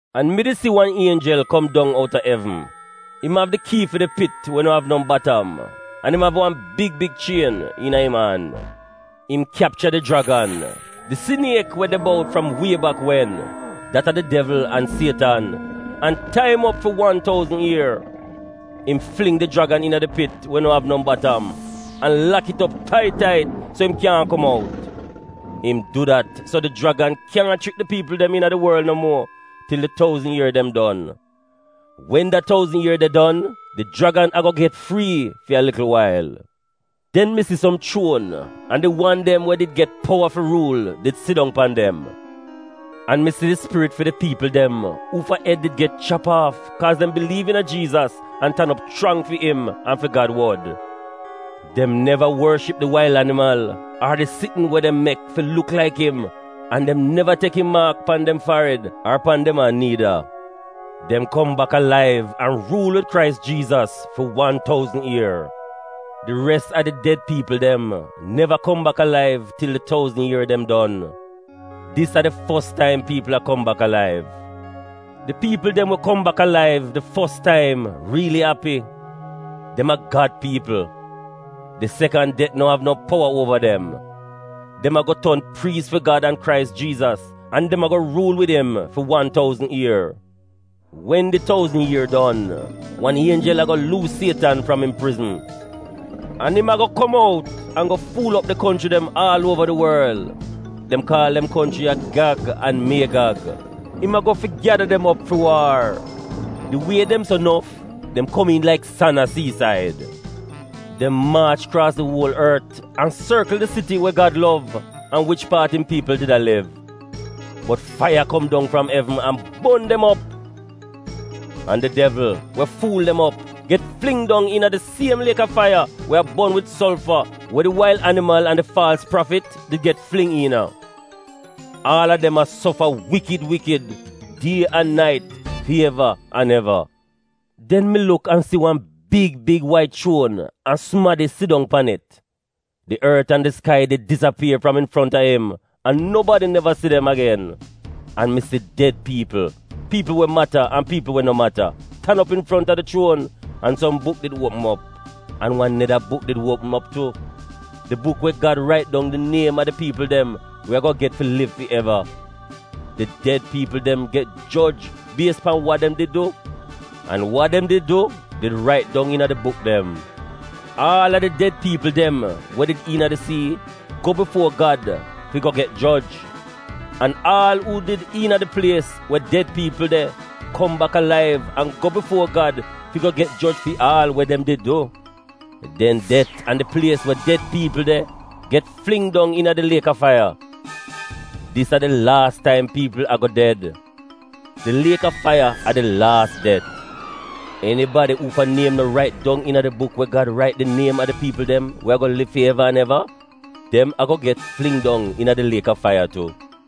An mi di si wan ienjel kom dong outa evn, im av di kii fi di pit we no av no batam an im av wan big big chien iina im an. Im kyapcha di jragan - di siniek we de bout fram wie bak wen, dat a di devl an Sietan, - an tai im op fi wan touzn ier. Im fling di jragan iina di pit we we no av no batam, an lak it op tait tait so im kyaahn kom out. Im du dat so di jragan kyaahn chrik di piipl dem iina di worl no muo til di touzn ier dem don. Wen da touzn ier de don, di jragan a go get frii fi a likl wail. Den mi si som chuon an di wan dem we did get powa fi ruul did sidong pan dem. An mi si di spirit fi di piipl dem uufa ed did get chap aaf kaaz dem biliiv iina Jiizas an tan op chrang fi im an fi Gad wod. Dem neva worship di wail animal ar di sitn we dem mek fi luk laik im an dem neva tek im maak pan dem farid ar pan dem an niida. Dem kom bak alaiv an ruul wid Krais Jiizas fi wan touzn ier. (Di res a di ded piipl dem neva kom bak alaiv til di touzn ier dem don.) Dis a di fos taim piipl a kom bak alaiv. Di piipl dem we kom bak alaiv di fos taim riili api. Dem a Gad piipl. Di sekan det no av no powa uova dem. Dem a go ton priis fi Gad an Krais Jiizas an dem a go ruul wid im fi wan touzn ier. Wen di touzn ier don, wan ienjel a go luus Sietan fram im prizn an im a go kom out an go ful op di konchri dem aal uova di worl - dem kaal dem konchri ya Gag an Miegag. Im a go fi gyada dem op fi waar. Di wie dem so nof, dem komiin laik san a siisaid. Dem maach kraas di uol ort an sorkl di siti we Gad lov an wich paat im piipl did a liv. Bot faiya kom dong fram evn an bon dem op. An di devl, we ful dem op, get fling dong iina di siem liek a faiya we a bon wid solfa we di wail animal an di faalz prafit did get fling iina. Aal a dem a sofa wikid wikid die an nait fi eva an eva. Den mi luk an si wan big, big, wait chuon an sumadi sidong pan it. Di ort an di skai did disapier fram infront a im an nobadi neva si dem agen. An mi si ded piipl, piipl we mata an piipl we no mata, tan op infront a di chuon, an som buk did opm op. An wan neda buk did opm op tu, di buk we Gad rait dong di niem a di piipl dem we a go get fi liv fi eva. Di ded piipl dem get joj bies pan wa dem did du. An wa dem did du did rait dong iina di buk dem. Aal a di ded piipl dem we did iina di sii go bifuo Gad fi go get joj. An aal uu did iina di plies we ded piipl de kom bak alaiv an go bifuo Gad fi go get joj fi aal we dem did du. Den det an di plies we ded piipl de get fling dong iina di liek a faiya. Dis a di laas taim piipl a go ded. Di liek a faiya a di laas det. Enibadi uufa niem no rait dong iina di buk we Gad rait di niem a di piipl dem we a go liv fi eva an eva, dem a go get fling dong iina di liek a faiya tu.